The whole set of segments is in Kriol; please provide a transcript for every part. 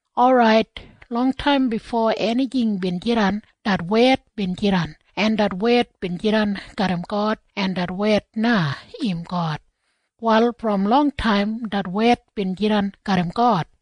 Orait, longtaim bifo enijing bin jidan, det Wed bin jidan, en det Wed bin jidan garram God, en det Wed na im God. Wal brom longtaim det Wed bin jidan garram God,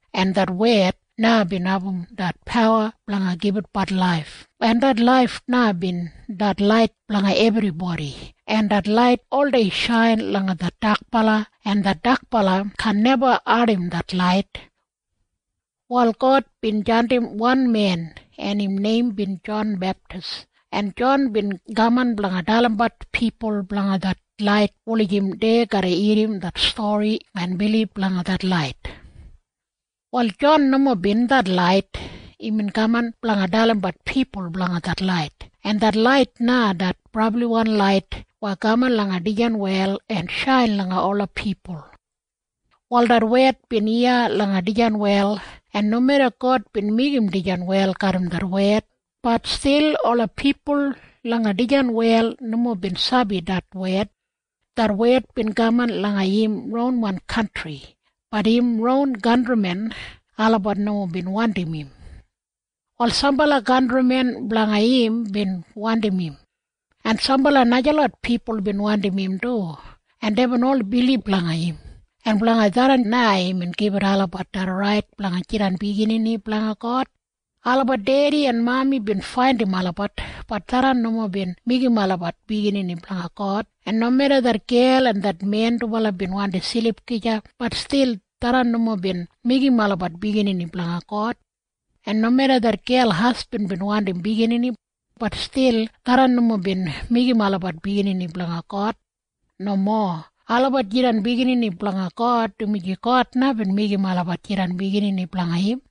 en det Wed na bin abum det pawa blanga gibitbat laif, en det laif na bin det lait blanga ebribodi, en det lait oldei shain langa det dakbala, en det dakbala kaan neba audim det lait. Wal God bin jandim wan men, en im neim bin Jon Beptis, en Jon bin kaman blanga dalimbat pipul blanga det lait wulijim dei garra irrim det stori en bilib langa det lait. Wal Jon nomo det lait. Imbin kaman blanga dalimbat pipul blanga det lait, en det lait na det brabliwan lait weya kaman langa dijan wel en shain langa ola pipul. Wal det Wed bin iya langa dijan wel, en nomeda God bin meigim dijan wel garram det Wed, bat stil ola pipul langa dijan wel nomo bin sabi det Wed. Det Wed bin kaman langa im ronwan kantri. Bat im ron kantrimen olabat nomo bin wandim im. Wal sambala kantrimen blanga im bin wandim im. En sambala najalot pipul bin wandim im du, en deibin ol bilib langa im. En blanga tharran na imbin gibit olabat det rait blanga jidan biginini blanga God. Olabat dedi en mami bin faindim olabat. Bat tharran nomo bin meigim olabat biginini blanga God. En nomeda det gel en det men dubala bin wandi silip gija, bat stil tharran nomo bin meigim olabat biginini blanga God. En nomeda det gel hasbin bin wandim biginini, bat stil tharran nomo bin meigim olabat biginini blanga God. Nomo. Olabat jidan biginini blanga God dumaji God na bin meigim olabat jidan biginini blanga im.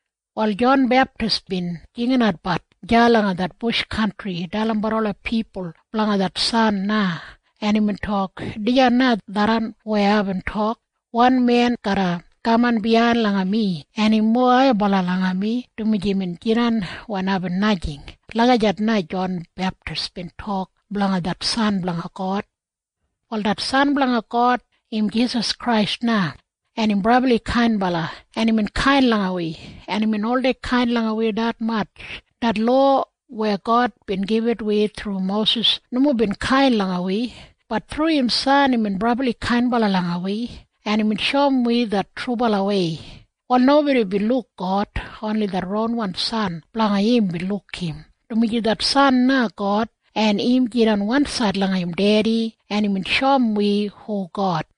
Wal Jon Beptis bin jinginatbat deya langa det bush kantri dalimbat ola pipul blanga det San na, en imbin tok, “Dijan na tharran weya aibin tok, ‘Wan men garra kaman biyain langa mi, en im mowa haibala langa mi, dumaji imbin jidan wen aibin najing.’” Lagijat na Jon Beptis bin tok blanga det San blanga God. Wal det San blanga God im Jisas Krais na, en im brabli kainbala, en imbin kain langa wi. En imbin oldei kain langa wi detmatj. Det lowa weya God bin gibit wi thru Mosis nomo bin kain langa wi. Bat thru im San imbin brabli kainbala langa wi, en imbin shoum wi det trubalawei. Wal nobodi bin luk God. Oni det ronwan San blanga im bin luk im, dumaji det San na God, en im jidan wansaid langa im Dedi, en imbin shoum wi hu God.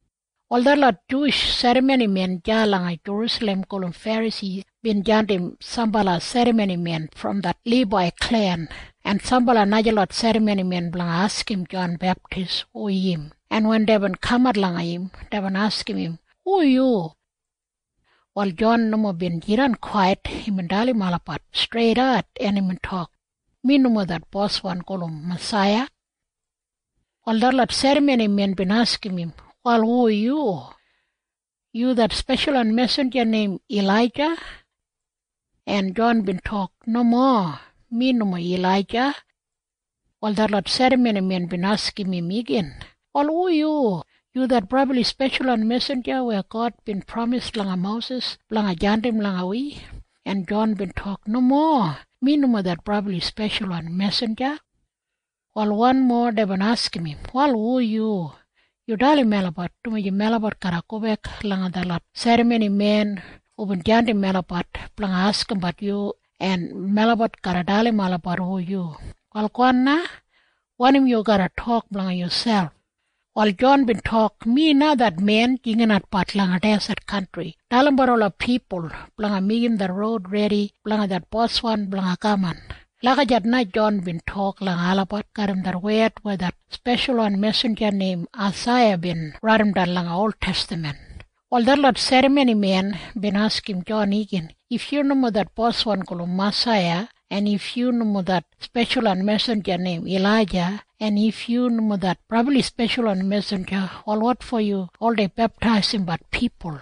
Wal detlot Juwish serramonimen deya langa Jerusalem gulum Ferasi bin jandim sambala serramonimen brom det Libai klen en sambala najalot serramonimen blanga askim Jon Beptis hu im, en wen deibin kamat langa im, deibin askim im, “Hu yu?” Wal Jon nomo bin jidan kwait. Imbin dalim olabat streidat, en imbin tok, “Mi nomo det Boswan gulum Masaiya.” Wal detlot serramonimen bin askim im, “Wal hu yu? Yu det speshalwan mesinja neim Ilaija?” En Jon bin tok, “Nomo. Mi nomo Ilaija.” Wal detlot serramonimen bin askim im igin, “Wal hu yu? Yu det brabli speshalwan mesinja weya God bin pramis langa Mosis blanga jandim langa wi?” En Jon bin tok, “Nomo. Mi nomo det brabli speshalwan mesinja.” Wal wanmo deibin askim im, “Wal hu yu? Yu dalim melabat, dumaji melabat garra gobek langa detlot serramonimen hubin jandim melabat blanga askimbat yu, en melabat garra dalim olabat hu yu. Wal gowan na. Wanim yu garra tok blanga yuselp?” Wal Jon bin tok, “Mi na det men jinginatbat langa deset kantri dalimbat ola pipul blanga meigim det roud redi blanga det Boswan blanga kaman.” Lagijat na Jon bin tok langa olabat garram det wed weya det speshalwan mesinja neim Aisaiya bin raidimdan langa oltestaman. Wal detlot serramonimen bin askim Jon igin, “If yu nomo det Boswan gulum Masaiya, en if yu nomo det speshalwan mesinja neim Ilaija, en if yu nomo det brabli speshalwan mesinja, wal wotfo yu oldei beptaisimbat pipul?”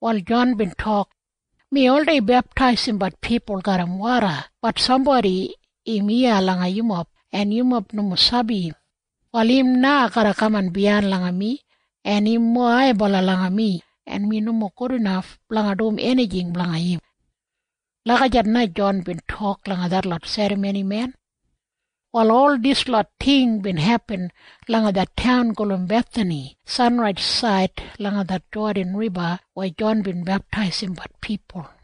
Wal Jon bin tok, “Mi oldei beptaisimbat pipul garram woda. Bat sambodi im iya langa yumob, en yumob nomo sabi im. Wal im na garra kaman biyain langa mi, en im mowa haibala langa mi, en mi nomo gudinaf blanga dum enijing blanga im.” Lagijat na Jon bin tok langa detlot serramonimen. Wal ol dislot ting bin hepin langa det taun gulum Bethani sanraisaid langa det Jodan Riba weya Jon bin beptaisimbat pipul.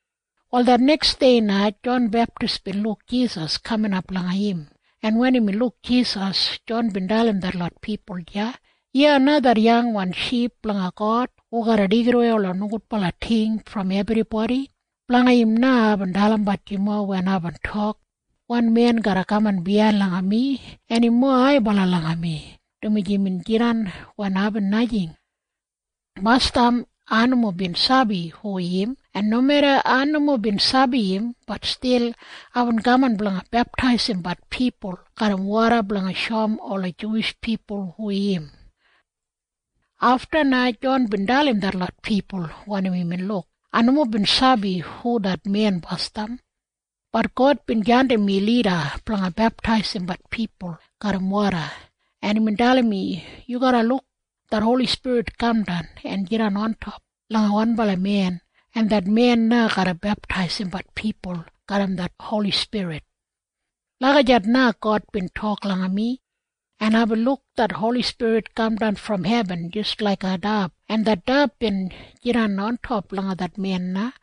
Wal det neksdei na Jon Beptis bin luk Jisas kaminap langa im, en wen imbin luk Jisas, Jon bin dalim detlot pipul deya, “Iya na det Yangwan Ship blanga God hu garra deigidawei ola nogudbala ting brom ebribodi. Blanga im na aibin dalimbat yumob wen aibin tok, ‘Wan men garra kaman biyain langa mi, en im mowa haibala langa mi, dumaji imbin jidan wen aibin najing.’ Basdam ai nomo bin sabi hu im. En nomeda ai nomo bin sabi im, bat stil aibin kaman blanga beptaisimbat pipul garram woda blanga shoum ola Juwish pipul hu im.” Afta na Jon bin dalim detlot pipul wanim imbin luk, “Ai nomo bin sabi hu det men basdam. Bat God bin jandim mi lida blanga beptaisimbat pipul garram woda, en imbin dalim mi, ‘Yu garra luk det Holi Spirit kamdan en jidan ontop langa wanbala men, en det men na garra beptaisimbat pipul garram det Holi Spirit.’ Lagijat na God bin tok langa mi. En aibin luk det Holi Spirit kamdan brom hebin jis laiga dab, en det dab bin jidan ontop langa det men na.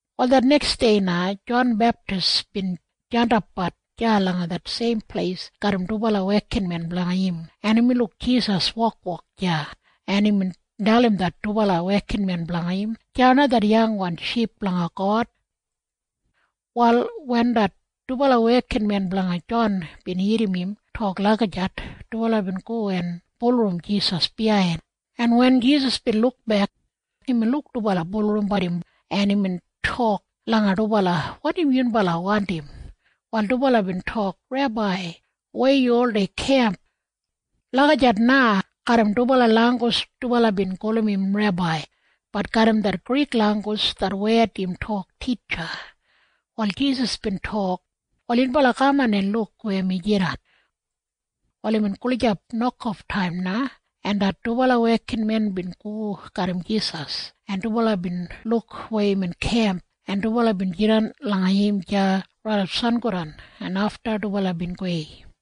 Wal det neksdei na Jon Beptis bin jandapbat deya langa det seim pleis garram dubala wekinmen blanga im, en imbin luk Jisas wokwok deya, en imbin dalim det dubala wekinmen blanga im, “Deya na det Yangwan Ship blanga God.” Wal wen det dubala wekinmen blanga Jon bin irrim im tok lagijat, dubala bin go en bulurrum Jisas biyain, en wen Jisas bin lukbek, imbin luk dubala bulurrumbat im, en imbin tok langa dubala, “Wanim yunbala wandim?” Wal dubala bin tok, “Rebai, weya yu oldei kemp?” Lagijat na garram dubala langgus dubala bin gulum im Rebai. Bat garram det Grik langgus det wed im tok Titja. Wal Jisas bin tok, “Wal yunbala kaman en luk weya mi jidan.” Wal imbin gulijap nokoftaim na, en det dubala wekinmen bin go garram Jisas, en dubala bin luk weya imbin kemp, en dubala bin jidan langa im deya raidap sangodan, en afta dubala bin gowei.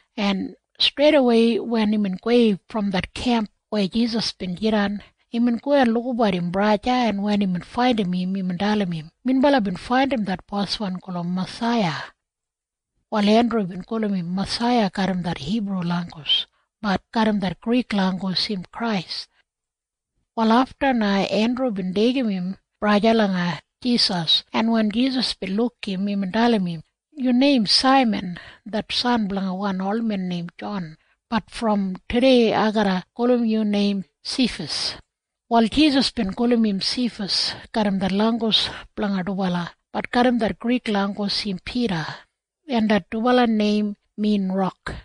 en streidawei wen imbin gowei brom det kemp weya Jisas bin jidan, imbin go en lukabat im braja, en wen imbin faindim im, imbin dalim im, “Minbala bin faindim det Boswan gulum Masaiya.” Wal Endru bin gulum im Masaiya garram det Hibru langgus. Bat garram det Grik langgus im Krais. Wal afta na Endru bin deigim im braja langa Jisas, en wen Jisas bin luk im, imbin dalim im, “Yu neim Saiman det san blanga wan olmen neim Jon. Bat brom tudei ai garra gulum yu neim Sifas.” Wal Jisas bin gulum im Sifas garram det langgus blanga dubala. Bat garram det Grik langgus im Pida. En det dubala neim min rok.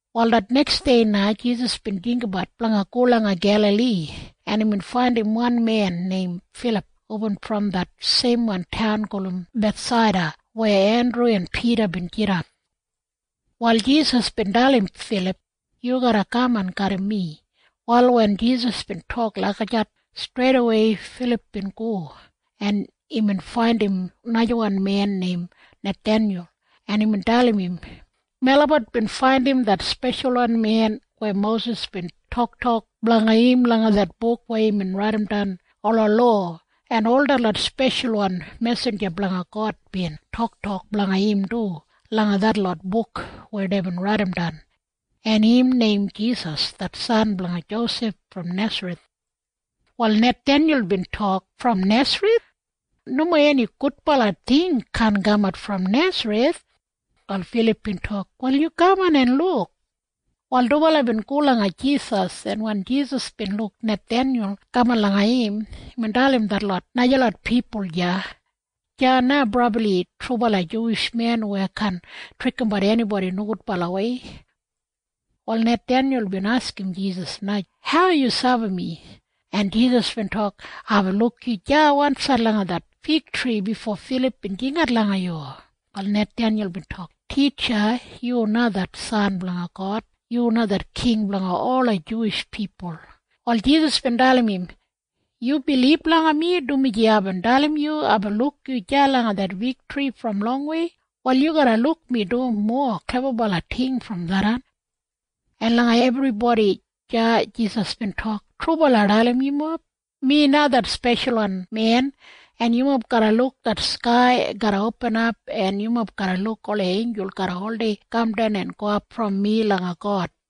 Wal det neksdei na Jisas bin jinggabat blanga go langa Gelali, en imbin faindim wan men neim Filip hubin brom det seimwan taun gulum Bethsaida weya Endru en Pida bin jidan. Wal Jisas bin dalim Filip, “Yu garra kaman garram mi.” Wal wen Jisas bin tok lagijat, streidawei Filip bin go, en imbin faindim najawan men neim Nathenyul, en imbin dalim im, “Melabat bin faindim det Speshalwan Men weya Mosis bin toktok blanga im langa det buk weya imbin raidimdan ola lowa, en ol detlot speshalwan mesinja blanga God bin toktok blanga im du langa detlot buk weya deibin raidimdan. En im neim Jisas det san blanga Josef brom Nesareth.” Wal Nathenyul bin tok, “Brom Nesareth? Nomo eni gudbala ting kaan kaman brom Nesareth!” Wal Filip bin tok, “Wal yu kaman en luk.” Wal dubala bin go langa Jisas, en wen Jisas bin luk Nathenyul kaman langa im, imbin dalim detlot najalot pipul deya, “Deya na brabli trubala Juwish men weya kaan trikimbat enibodi nogudbalawei.” Wal Nathenyul bin askim Jisas na, “Hau yu sabi mi?” En Jisas bin tok, “Aibin luk yu deya wansaid langa det figtri bifo Filip bin jingat langa yu.” Wal Nathenyul bin tok, “Titja, yu na det San blanga God! Yu na det King blanga ola Juwish pipul!” Wal Jisas bin dalim im, “Yu bilib langa mi dumaji aibin dalim yu aibin luk yu deya langa det figtri brom longwei? Wal yu garra luk mi dum mowa klebabala ting brom tharran.” En langa ebribodi deya Jisas bin tok, “Trubala ai dalim yumob. Mi na det Speshalwan Men, en yumob garra luk det skai garra opinap, en yumob garra luk ola einjul garra oldei kamdan en gowap brom mi langa God.”